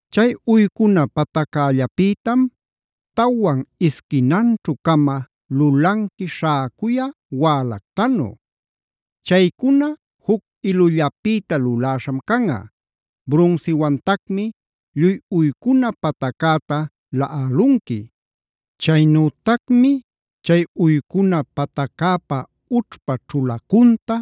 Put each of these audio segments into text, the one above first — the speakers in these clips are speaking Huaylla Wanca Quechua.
Chay uycuna pataccällapïtam tawan isquinanćhu-cama lulanqui śhäcuya wälactanu. Chaycuna juc ilullapïta luläśham canꞌa. Brunsiwantacmi lluy uycuna pataccäta laꞌalunqui. Chaynütacmi chay uycuna pataccäpa ućhpa ćhulacunta,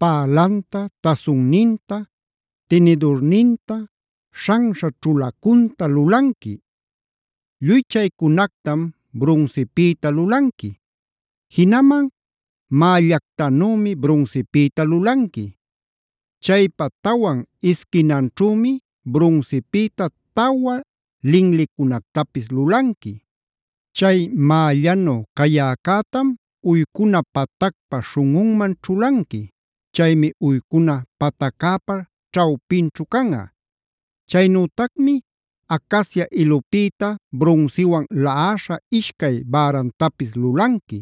pälanta, tasunninta, tinidurninta, śhanśha ćhulacunta lulanqui. Lluy chaycunactam brunsipïta lulanqui. Jinaman mällactanümi brunsipïta lulanqui. Chaypa tawan isquinanćhümi brunsipïta tawa linlicunactapis lulanqui. Chay mällanu cayäcätam uycuna patacpa śhunꞌunman ćhulanqui. Chaymi uycuna pataccäpa ćhawpinćhu canꞌa. Chaynütacmi acacia ilupïta brunsiwan laꞌaśha ishcay bärantapis lulanqui.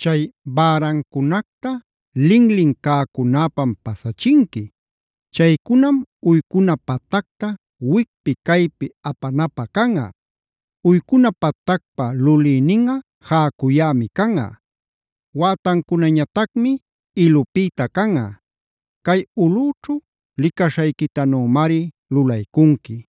Chay bärancunacta linlin cäcunäpam pasachinqui. Chaycunam uycuna patacta wicpi caypi apanapä canꞌa. Uycuna patacpa lulïninꞌa jäcuyämi canꞌa. Wätancunañatacmi ilupïta canꞌa. Cay ulꞌüćhu licaśhayquitanümari lulaycunqui.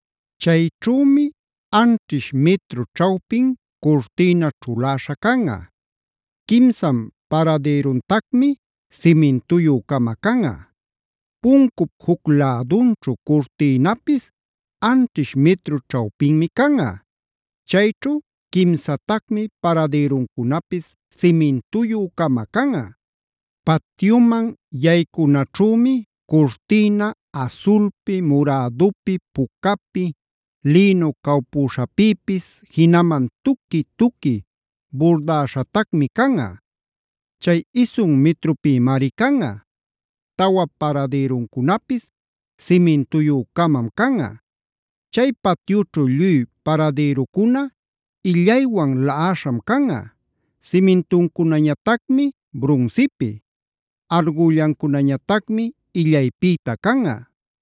Chayćhümi anćhish mitru ćhawpin curtïna ćhuläśha canꞌa. Quimsan paradïruntacmi simintuyü-cama canꞌa. Puncup juc lädunćhu curtïnapis anćhish mitru ćhawpinmi canꞌa. Chayćhu quimsatacmi paradïruncunapis simintuyü-cama canꞌa. Patyuman yaycunaćhümi curtïna asulpi, murädupi, pucapi, lïnu cawpüśhapïpis, jinaman tuqui-tuqui burdäśhatacmi canꞌa. Chay isun mitrupïmari canꞌa. Tawa paradïruncunapis simintuyü-camam canꞌa. Chay patyućhu lluy paradïrucuna illaywan laꞌaśham canꞌa; simintuncunäñatacmi brunsipi; argüllancunañatacmi illaypïta canꞌa.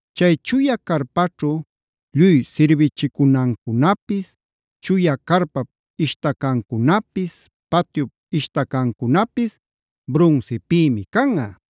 Chay chuya carpaćhu lluy sirbichicunancunapis, chuya carpap ishtacancunapis, patyup ishtacancunapis brunsipïmi canꞌa.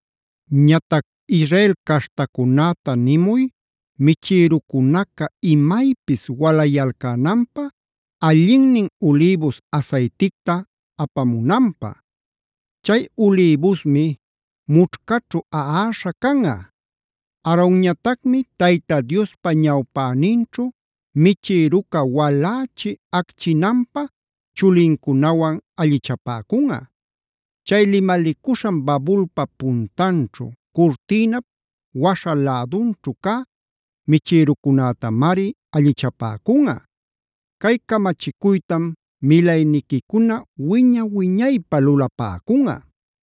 “Ñatac Israel caśhtacunäta nimuy, michïrucunaca imaypis walayalcänanpä allinnin ulïbus asayticta apamunanpä. Chay ulïbusmi mućhcaćhu aꞌaśha canꞌa. Aaronñatacmi Tayta Diospa ñawpäninćhu michïruca walächi acchinanpä chulincunawan allichapäcunꞌa. Chay limalicuśhan babulpa puntanćhu curtïnap waśha lädunćhu cä michïrucunätamari allichapäcunꞌa. Cay camachicuytam milayniquicuna wiña-wiñaypä lulapäcunꞌa.